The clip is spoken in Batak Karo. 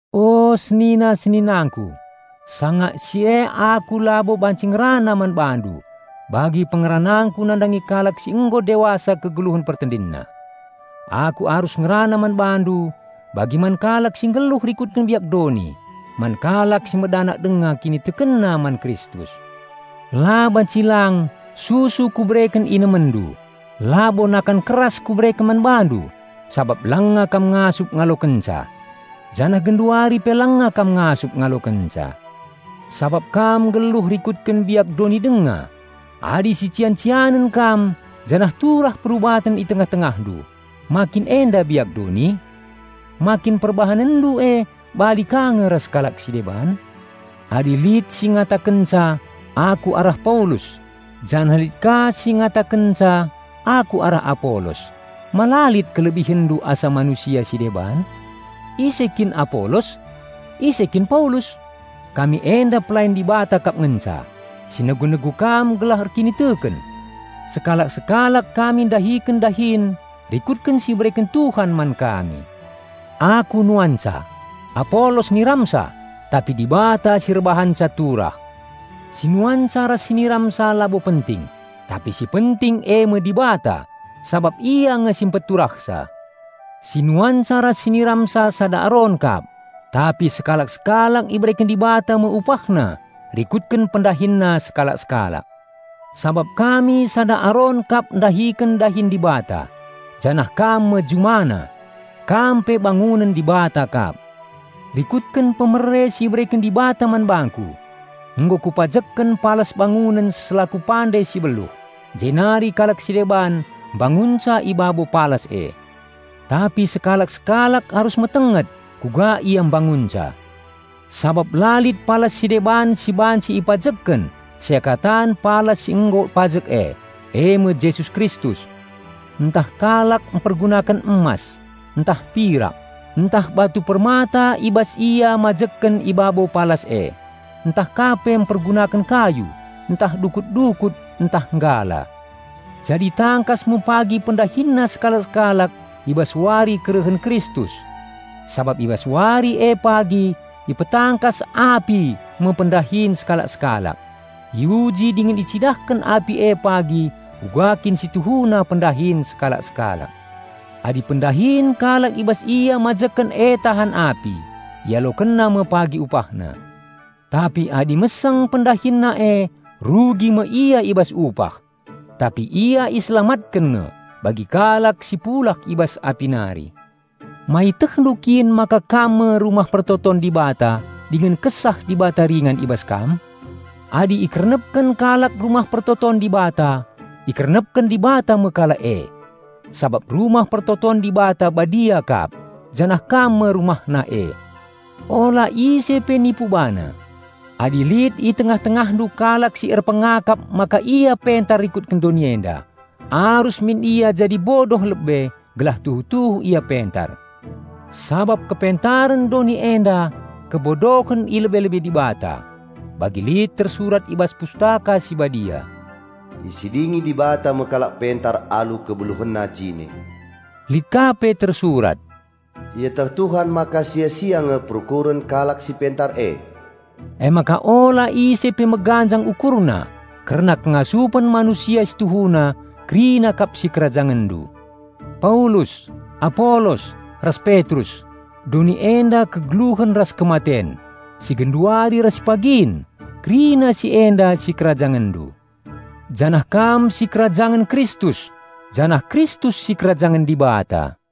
O senina-seninangku, sanga si e aku labo banci ngerana man bandu bagi pengeranangku nandangi kalak si nggo dewasa kegeluhen pertendinna. Aku arus ngerana man bandu bagi man kalak si nggeluh rikutken biak doni, man kalak si medanak denga kinitekenna man Kristus. La banci lang susu kubereken inemenndu, labo nakan keras kubereken man bandu, sabap langa kam ngasup ngalokenca. Janah genduari pe langa kam ngasup ngalokenca. Sabap kam nggeluh rikutken biak doni denga. Adi sician-cianen kam janah turah perubaten i tengah-tengahndu, ma kin enda biak doni? Ma kin perbahanenndu e bali ka nge ras kalak si deban? Adi lit si ngatakenca, "Aku arah Paulus," janah lit ka si ngatakenca, "Aku arah Apolos," ma la lit kelebihenndu asa manusia si deban? Ise kin Apolos? Ise kin Paulus? Kami enda pelayan Dibata kap ngenca, si negu-negu kam gelah erkiniteken. Sekalak-sekalak kami ndahiken dahin rikutken si ibereken Tuhan man kami. Aku nuanca, Apolos niramsa; tapi Dibata si erbahanca turah. Si nuanca ras si niramsa labo penting, tapi si penting eme Dibata, sabap ia nge si peturahsa. Si nuanca ras si niramsa sada aron kap; tapi sekalak-sekalak ibereken Dibata me upahna rikutken pendahinna sekalak-sekalak. Sabap kami sada aron kap ndahiken dahin Dibata, janah kam me JumaNa. Kam pe bangunen Dibata kap. Rikutken pemere si ibereken Dibata man bangku, nggo kupajekken palas bangunen selaku pande si beluh, jenari kalak si deban mbangunca i babo palas e. Tapi sekalak-sekalak arus metenget kuga ia mbangunca. Sabap la lit palas si deban si banci ipajekken seakatan palas si nggo pajek e, eme Jesus Kristus. Ntah kalak mpergunaken emas, ntah pirak, ntah batu permata i bas ia mbangun i babo palas e; ntah ka pe mpergunaken kayu, ntah dukut-dukut, ntah nggala. Jadi tangkas me pagi pendahinna sekalak-sekalak i bas wari kerehen Kristus. Sabap i bas wari e pagi ipetangkas api me pendahin sekalak-sekalak; iuji dingen icidahken api e pagi uga kin si tuhuna pendahin sekalak-sekalak. Adi pendahin kalak i bas ia mbangun e tahan api, ialokenna me pagi upahna. Tapi adi meseng pendahinna e rugi me ia i bas upah; tapi ia iselamatken nge, bagi kalak si pulah i bas api nari. Ma ietehndu kin maka kam me Rumah Pertoton Dibata dingen Kesah Dibata ringan i bas kam? Adi ikernepken kalak Rumah Pertoton Dibata, ikernepken Dibata me kalak e. Sabap Rumah Pertoton Dibata badia kap, janah kam me RumahNa e. Ula ise pe nipu bana. Adi lit i tengah-tengahndu kalak si erpengakap maka ia pentar rikutken doni enda, arus min ia jadi bodoh lebe, gelah tuhu-tuhu ia pentar. Sabap kepentaren doni enda kebodohen i lebe-lebe Dibata. Bagi lit tersurat i bas Pustaka Si Badia, "Isidingi Dibata me kalak pentar alu kebeluhenna jine." Lit ka pe tersurat, "Ieteh Tuhan maka sia-sia nge perukuren kalak si pentar e." Emaka ula ise pe meganjang ukurna kerna kengasupen manusia si tuhuna kerina kap sikerajangenndu: Paulus, Apolos, ras Petrus; doni enda, kegeluhen ras kematen, si genduari ras si pagin; kerina si enda sikerajangenndu: janah kam sikerajangen Kristus, janah Kristus sikerajangen Dibata.